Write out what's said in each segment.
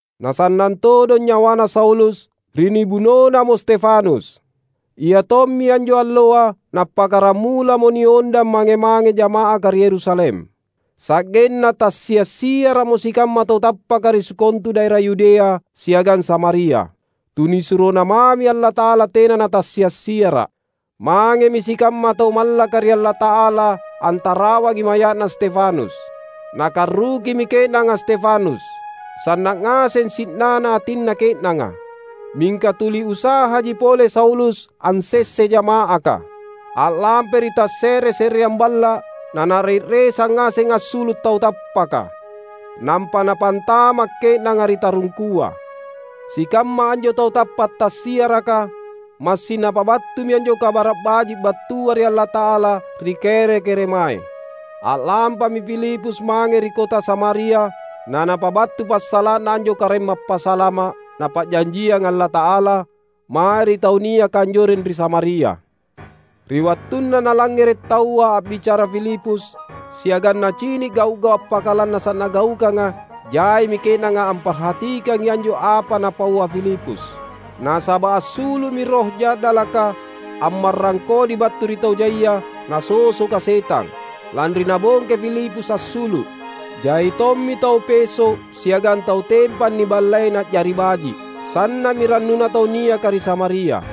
Na sannang todong nyawana Saulus ri nibunonamo Stefanus. Iatommi anjo alloa nappakkaramulamo niondang mange-mange jama’aka ri Yerusalem. Sa’genna tassia’-siara’mo sikamma tau tappaka ri sikontu daera Yudea siagang Samaria. TunisuroNa mami Allata’ala tena natassia’-siara’. Mangemi sikamma tau mallaka ri Allata’ala antarawangi maya’na Stefanus. Nakarrukimi ke’nanga Stefanus. Sanna’ ngaseng si’nana atinna ke’nanga. Mingka tuli usahaji pole Saulus ansessai jama’aka. A’lampai ri tasse’re-se’reang balla’, nanare’resang ngaseng assulu’ tau tappaka. Nampa napantama’ ke’nanga ri tarungkua. Sikamma anjo tau tappa’ tassiaraka, massing napabattumi anjo Kabara’ Baji’ battua ri Allata’ala ri kere-keremae. A’lampami Filipus mange ri kota Samaria na napabattu passala’na anjo Karaeng Mappasalama’ Napa’janjianga Allata’ala, mae ri tau niaka anjoreng ri Samaria. Ri wattunna nalangngere’ taua a’bicara Filipus, siagang nacini’ gau’-gau’ appakalannasa’ nagaukanga, jaimi ke’nanga amparhatikangi anjo apa napaua Filipus. Nasaba’ assulu’mi roh ja’dalaka ammarrang kodi battu ri tau jai nasosoka setang, lanri nabongkai Filipus assulu’. Jai tommi tau peso’ siagang tau tempang niballei na’jari baji’. Sanna’mi rannuna tau niaka ri Samaria.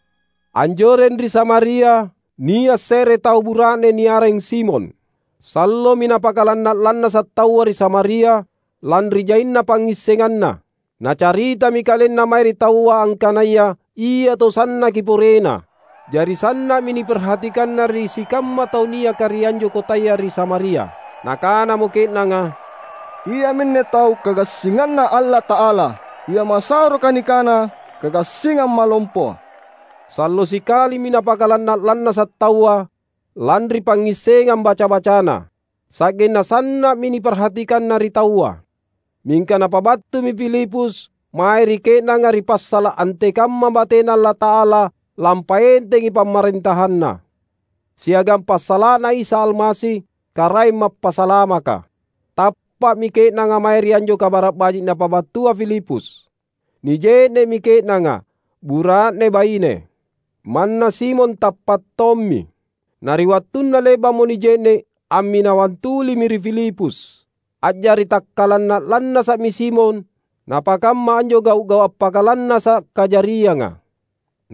Anjoreng ri Samaria nia’ se’re tau bura’ne niareng Simon. Sallomi napakalanna’-lannasa’ taua ri Samaria lanri jaina pangngissenganna. Nacaritami kalenna mae ri taua angkanaya ia tau sannaki porena. Jari sanna’mi niparhatikanna ri sikamma tau niaka ri anjo kotaya ri Samaria. Nakanamo ke’nanga, "Iaminne tau kagassinganNa Allata’ala, ia masahoroka nikana, ‘Kagassingang Malompoa.’" Sallo sikalimi napakalanna’-lannasa’ taua lanri pangngissengang baca-bacana. Sa’genna sanna’mi niparhatikanna ri taua. Mingka napabattumi Filipus mae ri ke’nanga ri passala’ antekamma bateNa Allata’ala lampaentengi PamarentahanNa, siagang passala’na Isa Almasi, Karaeng Mappasalamaka. Tappa’mi ke’nanga mae ri anjo kabara’ Baji’ napabattua Filipus. Nije’ne’mi ke’nanga, bura’ne-baine. Manna Simon tappa’ tommi. Na ri wattunna le’ba’mo nije’ne’, amminawang tulimi ri Filipus. A’jari takkalanna’-lannasa’mi Simon napakamma anjo gau’-gau’ appakalannasa’ kajarianga.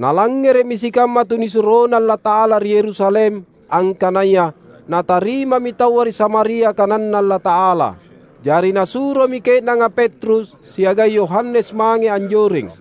Nalangngere’mi sikamma tunisuroNa Allata’ala ri Yerusalem angkanaya natarimami taua ri Samaria kananNa Allata’ala. Jari nasuromi ke’nanga Petrus siagang Yohanes mange anjoreng.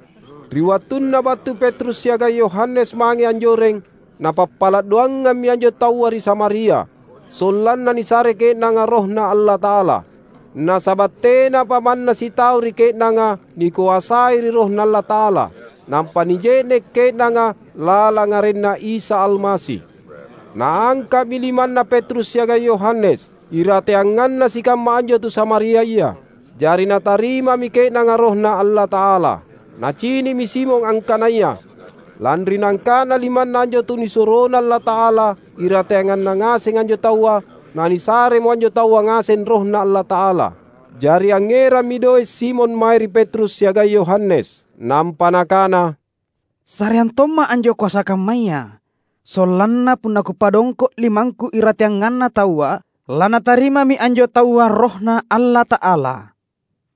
Ri wattunna battu Petrus siagang Yohanes mange anjoreng, napappala’ doangammi anjo taua ri Samaria, sollanna nisare ke’nanga RohNa Allata’ala. Nasaba’ tenapa manna sitau ri ke’nanga nikoasai ri RohNa Allata’ala; nampa nije’ne’ ke’nanga lalang arenNa Isa Almasi. Naangka’mi limanna Petrus siagang Yohanes, irateanganna sikamma anjo tu Samariaya; jari natarimami ke’nanga RohNa Allata’ala. Nacini’mi Simon angkanaya lanri naangka’na limanna anjo tunisuroNa Allata’ala irateanganna ngaseng anjo taua, nanisaremo anjo taua ngaseng RohNa Allata’ala. Jari angngerammi doe’ Simon mae ri Petrus siagang Yohanes, nampa nakana, "Sareang tomma’ anjo koasa kammaya, sollanna punna kupadongko’ limangku irateanganna taua, lanatarimami anjo taua RohNa Allata’ala."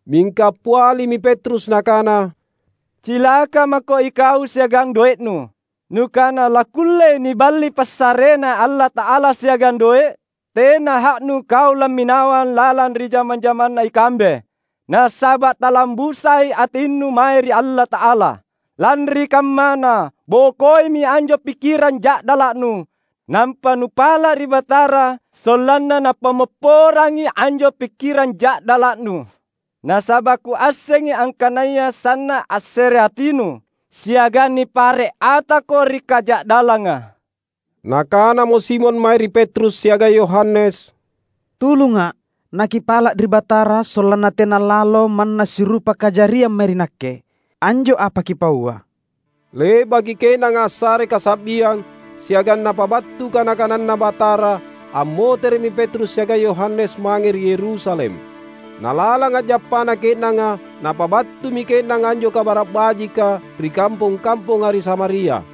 Mingka appialimi Petrus nakana, "Cilaka mako ikau siagang doe’nu! Nukana lakkullei niballi passareNa Allata’ala siagang doe’? Tena ha’nu kau lamminawang lalang ri jama-jamanna ikambe, nasaba’ talambusai atinnu mae ri Allata’ala. Lanri kammana, bokoimi anjo pikkirang ja’dala’nu, nampa nupala’ ri Batara sollanna Napammopporangi anjo pikkirang ja’dala’nu. Nasaba’ kuassengi angkanaya sanna’ assereatinu, siagang nipare’ atako ri kaja’dallanga." Nakanamo Simon mae ri Petrus siagang Yohanes, "Tulunga’, nakipala’ ri Batara sollanna tena lalo manna sirupa kajariang mae ri nakke, anjo apa kipaua." Le’baki ke’nanga assare kasa’biang siagang napabattu kana-kananNa Batara, ammotere’mi Petrus siagang Yohanes mange ri Yerusalem. Na lalang a’jappana ke’nanga, napabattumi ke’nanga anjo Kabara’ Bajika ri kampong-kamponga ri Samaria.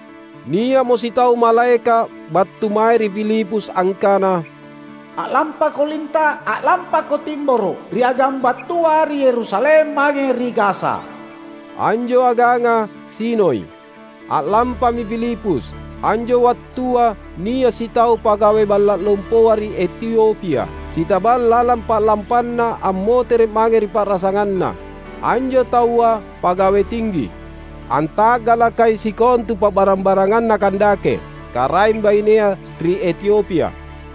Nia’mo sitau malaeka’ battu mae ri Filipus angkana, "A’lampako linta’! A’lampako timboro’, ri agang battua ri Yerusalem mange ri Gaza." Anjo aganga sinoi. A’lampami Filipus. Anjo wattua nia’ sitau pagawe balla’ lompoa ri Etiopia, sitabang lalang pa’lampanna ammotere’ mange ri pa’rasanganna. Anjo taua pagawe tinggi, anta’galakai sikontu pa’barang-baranganna Kandake, karaeng bainea ri Etiopia.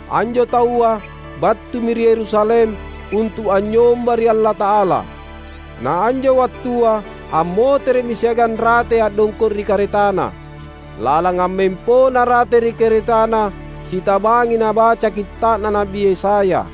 Anjo taua battumi ri Yerusalem, untu’ anynyomba ri Allata’ala. Na anjo wattua ammotere’mi siagang ratei a’dongko’ ri karetana. Lalang ammempona rate ri karetana, sitabangi nabaca Kitta’na Na’bi Yesaya.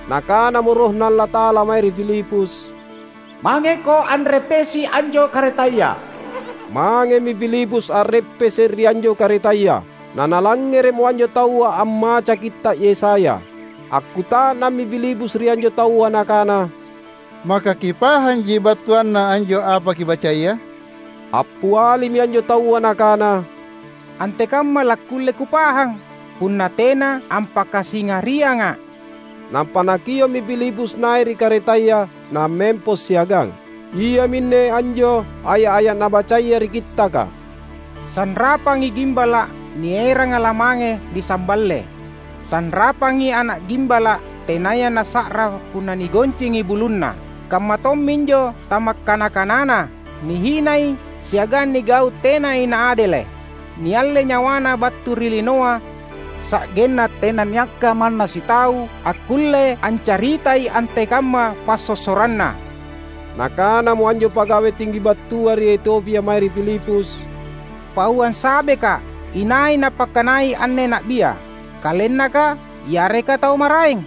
Nakanamo RohNa Allata’ala mae ri Filipus, "Mangeko anreppesi anjo karetaya." Mangemi Filipus a’reppese’ ri anjo karetaya, nanalangngere’mo anjo taua ammaca Kitta’ Yesaya. Akkuta’nammi Filipus ri anjo taua nakana, "Maka kipahanji battuanna anjo apa kibacaya?" Appialimi anjo taua nakana, "Antekamma lakkulle kupahang punna tena ampakasingarianga’?" Nampa nakio’mi Filipus nai’ ri karetaya nammempo siagang. Iaminne anjo aya’-aya’ nabacaya ri Kittaka, "Sanrapangi gimbala’ nieranga lamange nisamballe, sanrapangi ana’ gimbala’ tenaya nassa’ra punna nigoncingi bulunna, kamma tomminjo tamakkana-kanana. Nihinai siagang nigau’ tenai naadele’. Niallei nyawaNa battu ri linoa sa’genna tenanniakka manna sitau akkulle ancaritai antekamma passossoranNa." Nakanamo anjo pagawe tinggi battua ri Etiopia mae ri Filipus, "Pauang sabeka’, inai napakkanai anne na’bia? Kalennaka, yareka tau maraeng?"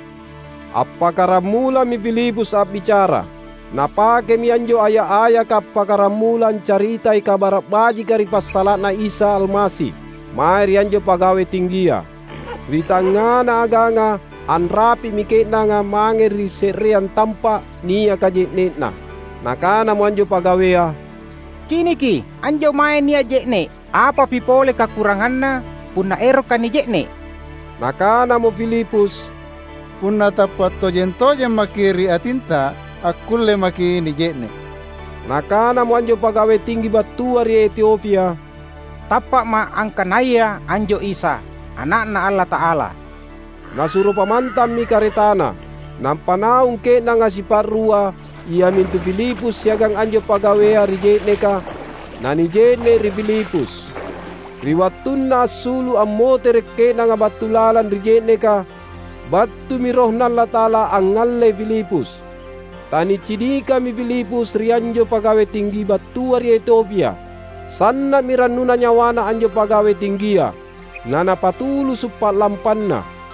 Appakkaramulami Filipus a’bicara. Napakemi anjo aya’-ayaka appakkaramula ancaritai Kabara’ Bajika ri passala’na Isa Almasi, mae ri anjo pagawe tinggia. Ri tangngana aganga; anrapi’mi ke’nanga mange ri se’reang tampa’ niaka je’ne’na. Nakanamo anjo pagawea, "Ciniki, anjo mae nia’ je’ne’! Apapi pole kakuranganna punna erokka’ nije’ne’?" [Nakanamo Filipus, "Punna tappa' tojeng-tojemmaki' ri atinta, akkulle maki' nije'ne'." Nakanamo anjo pagawe tinggi battua ri Etiopia, "Tappa'ma' angkanaya anjo Isa, Ana'Na Allata'ala."] Nasuro pamantammi karetana. Nampa naung ke’nanga sipa’rua iamintu Filipus siagang anjo pagawea ri je’neka, nanije’ne’ ri Filipus. Ri wattunna assulu’ ammotere’ ke’nanga battu lalang ri je’neka, battumi RohNa Allata’ala angngallei Filipus. Tanicinikami Filipus ri anjo pagawe tinggi battua ri Etiopia. Sanna’mi rannuna nyawana anjo pagawe tinggia, nanapatulusu’ pa’lampanna.